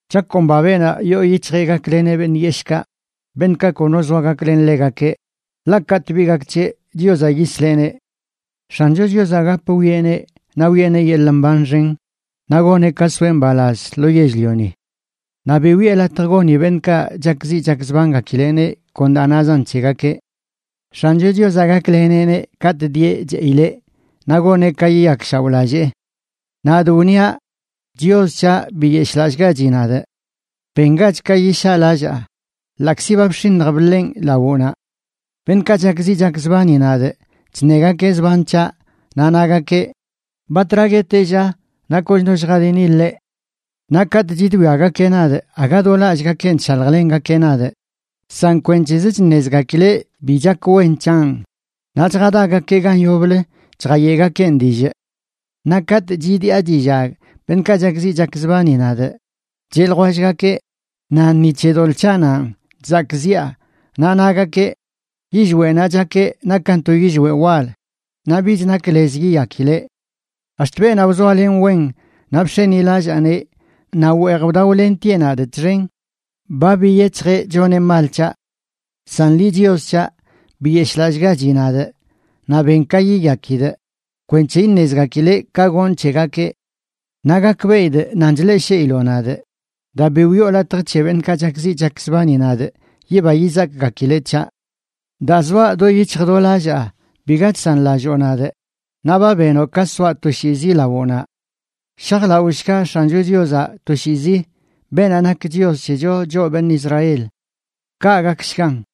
Chakomba beenaꞌ yoo yic̱hjeꞌ gakleneꞌ beṉꞌ yeshꞌkaꞌ, beṉꞌkaꞌ kono zoa gaklen ḻegakeꞌ, ḻaꞌ katꞌ bi gak c̱heꞌ Chiozaꞌ yisleꞌneꞌ. X̱ancho Chiozaꞌ gap wwieꞌneꞌ, naꞌ wiꞌeneꞌ yeḻꞌ mban xen, naꞌ goneꞌ ka soeꞌ mbalaz lo yell-lioni. Naꞌ bi wiꞌe latj goni beṉꞌkaꞌ chakziꞌ chakzbangakileꞌneꞌ kon daa nazan c̱hegakeꞌ. X̱ancho Chiozaꞌ gakleneꞌneꞌ katꞌ dieꞌ cheꞌileꞌ, naꞌ goneꞌ ka yiyakshaoꞌlallee. Nadꞌ wniaꞌ: “Chios c̱haꞌ, biyeshꞌlallꞌgachi nadꞌ. Bengach ka yishaꞌlallaa, ḻaꞌkzi ba bx̱iṉj bḻenꞌ lawoꞌnaꞌ.” Beṉꞌkaꞌ chakziꞌ chakzbani nadꞌ chṉegakeꞌ zban c̱haꞌ naꞌ nagakeꞌ: “¿Batra gueteꞌ, lla, naꞌ kochno lljadini ḻeꞌ?” Naꞌ katꞌ chidwiagakeꞌ nadꞌ, aga do lallꞌgakenꞌ chshaljlengakeꞌ nadꞌ, san kwenc̱hez chṉezgakileꞌ bi chak wen c̱hanꞌ naꞌ chjadagakeꞌ gan yoblə chjayeꞌgakeꞌn dillꞌ. Naꞌ katꞌ chidiꞌa chillag beṉꞌkaꞌ chakziꞌ chakzbani nadꞌ cheꞌ ljwellgakeꞌ nan ni c̱he doḻꞌ c̱haꞌnanꞌ chzakꞌziꞌa, naꞌ nagakeꞌ: “Yillweꞌnaꞌ chakeꞌ nakan to yillweꞌ wal, naꞌ bich nak lez yiyakileꞌ.” Ax̱t beenaꞌ wzoalenꞌ wen, naꞌ bx̱enilallaaneꞌ, naꞌ weej wdaolentieꞌ nadꞌ txen, ba biyec̱hjeꞌ choneꞌ mal c̱haꞌ. San liꞌ, Chios c̱haꞌ, biyeshꞌlallꞌgachi nadꞌ, naꞌ ben ka yiyakidꞌ kwenc̱he iṉezgakileꞌ ka gonꞌ c̱hegakeꞌ. Naꞌ gakbeꞌidꞌ nan chleꞌshiiloꞌ nadꞌ daa bi wiꞌo latj c̱he beṉꞌkaꞌ chakziꞌ chakzbani nadꞌ yiba yizakgakileꞌ c̱haꞌ. Daa zoaꞌ do yic̱hj do lallaa biga chsanlalloo nadꞌ, naꞌ ba benoꞌ ka soaꞌ toshiizi lawoꞌnaꞌ. Shajlaoshga X̱ancho Chiozaꞌ toshiizi, beenaꞌ nak Chios c̱hecho, choꞌ beṉꞌ Israel. Kaꞌ gakshgan.